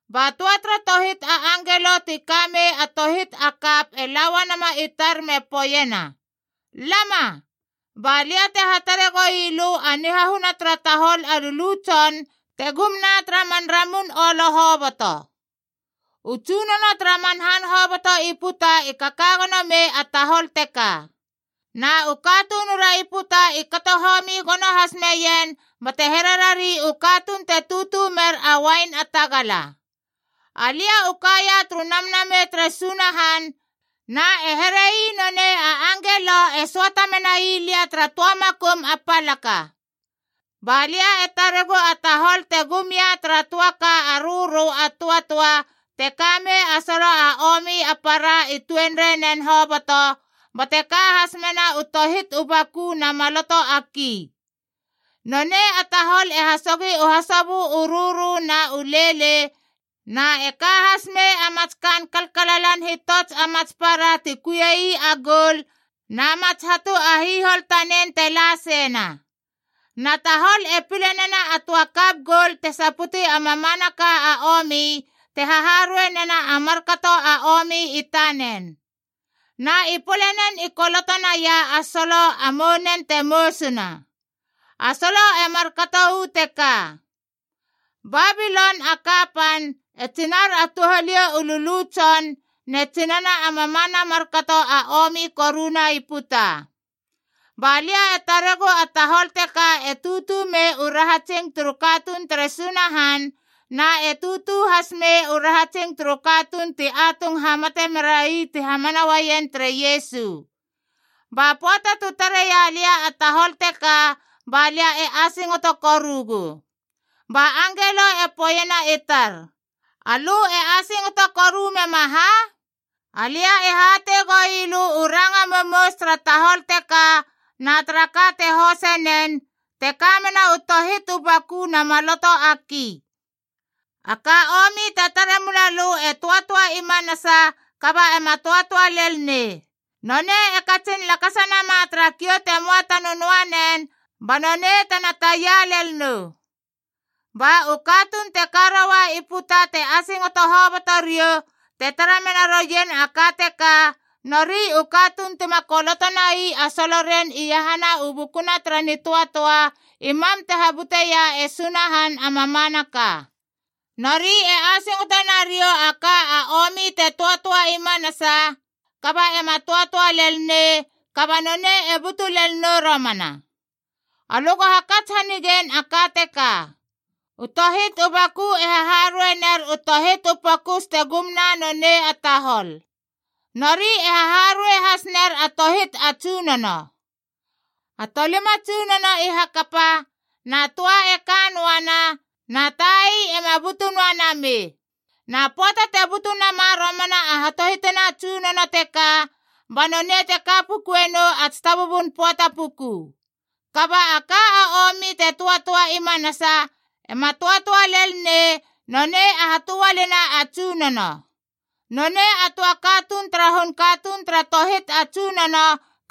Ba töa tara tohit a angelo ti ka mei a tohit a kap e la uanama i tar me poeiena, “Lama, balia te hatare goui lö a nihahuna tara tahol a lulu tson te gumna tara man ramun olo hoboto. U tsunono tara man han hoboto i puta i kaka gono mei a tahol teka. Na u katunura i puta i kato homi gono has meien bate here rari u katuun te tutu mer a uain a tagala.” Alia u kaia turu Namnamei tere Sunahan na e here ii nonei a angelo e söata menai lia tara töa makum a palaka. Ba lia e taregu a tahol te gum ia tara töa ka a rörö a töatöa te ka mei a solo a omi a para i tuenreinen hoboto, bate ka has mena u tohit u baku na maloto a ki. Nonei a tahol e hasogi u hasobö u rörö na u leilei, na e ka has mei a mats kaan kalalan hitots a mats para ti kuiei a goul na mats hatu a hihol tanen te la seina.a Na tahol e pile nena a töa kap goul te saputi a mamanaka a omi te haharuei nena a markato a omi i tanen. Na i polenen i koloto naia a solo a mounen te mousuna. A solo e markato uu teka: BABILON A KAPAN, E TSINAR A TOUHALIOU U LULU TSON NE TSINANA A MAMANA A MARKATO A OMI KORUNA I PUTA. Ba lia e taregu a tahol teka e tutu mei u rahatsingb turu katuun tere Sunahan, na e tutu has mei u rahatsing turu katuun ti atung hamate merai ti hamana uaien tere Iesu. Ba pöata tu tareia lia a tahol teka ba lia e asingoto korugu. Ba angelo e poeiena i tar, “Alö e asingoto koru mema ha? Alia e hatei goi lö u ranga mousmous tara tahol teka na tara ka te hosei nen, te ka mena u tohit u baku na maloto a ki. A ka omi te tare mula lö e töatöa i manasa kaba ema töatöa lel nei. Nonei e katsin lakasa nama tara kiou te möa ta nönöanen ba nonei tena taia lel nou. Ba u katuun te ka roua i puta te asingoto hoboto riou te tara mena roien a ka teka, nori u katuun tima koloto nai a soloren iahana u bukuna tara nitöatöa i mam te habuteia e Sunahan a mamanaka. Nori e asingoto nariou a ka a omi te töatöa i manasa kaba ema töatöa lel nei, kaba nonei e butu lel nou romana. “Alö go hakats hanigein a ka teka. U tohit u baku e haharuei ner u tohit u pokus te gumna nonei a tahol. Nori e haharuei has ner a tohit a tsunono. A tolima tsunono i hakapa, na töa e ka noana, na tai ema butu noa namei. Na pöata te butu nama romana a hatohitina a tsunono teka, ba nonei te ka pukue nou a tsitabubun pöata puku. Kaba a ka a omi te töatöa i manasa ema töatöa lel nei, nonei a hatoalina a tsunono. Nonei a töa katuun tara hun katuun tara tohit a tsunono,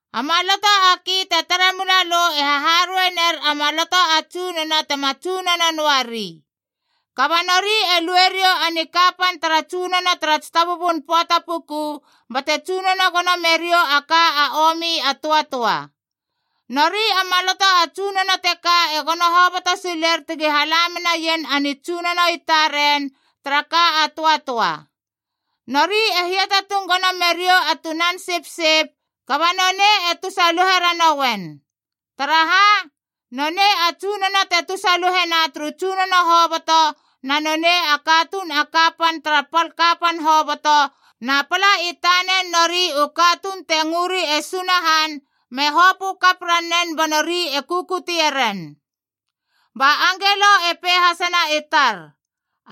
“A maloto a ki te tare mula lö e haharuei ner a maloto a tsunono tema tsunono noari. Kaba nori e lue riou a nikapan tara tsunono tara tsitabubun pöata pukud bate tsunono gono meriou a ka a omi a töatöa. Nori a maloto a tsunono teka e gono hoboto siler tegi hala menaien a nitsunono i taren tara ka a töatöa.e Nori e hiatatung gono meriou a Tunan Sipsip, kaba nonei e tusaluhe ranouen. Taraha? Nonei a Tsunono te tusaluhena turu tsunono hoboto na nonei a katuun a kapan tara pal kapan hoboto, na pala i tanen nori u katuun te ngöri e Sunahan me hopö kap ranen ba nori e kukutie ren.” Ba angelo e pei hasena i tar,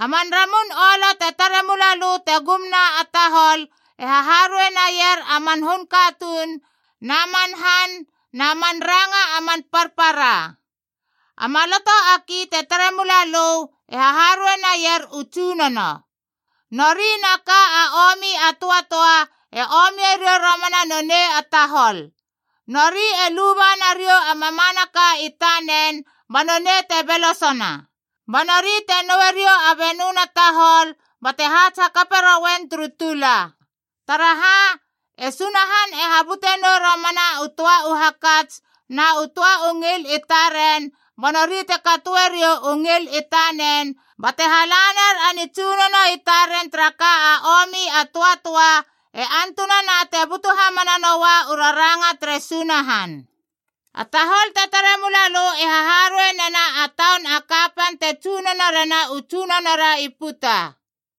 “A man ramun olo te tare mula lö te gumna a taholf e haharuei naier a man hun katuun na man han na man ranga a man parpara. A maloto a ki te tare mula lö e haharuei naier u tsunono. Nori na ka a omi a töatöa e omie riou romana nonei a tahol. Nori e luba nariou a mamanaka i tanen ba nonei te belosona. Ba nori te noue riou a benöna tahol bate haats hakape rouen turu tula. Taraha? E Sunahan e habute nou romana u töa u hakats na u töa u ngil i taren ba nori te katoe riou u ngil i taneng bate hala ner a nitsunono i taren tara ka a omi a töatöa, e antunana te butu hamana noua u raranga tere Sunahan. “A tahol te tare mula lö e haharuei nena a taun a kapan te tsunono rena u tsunono ri puta.”h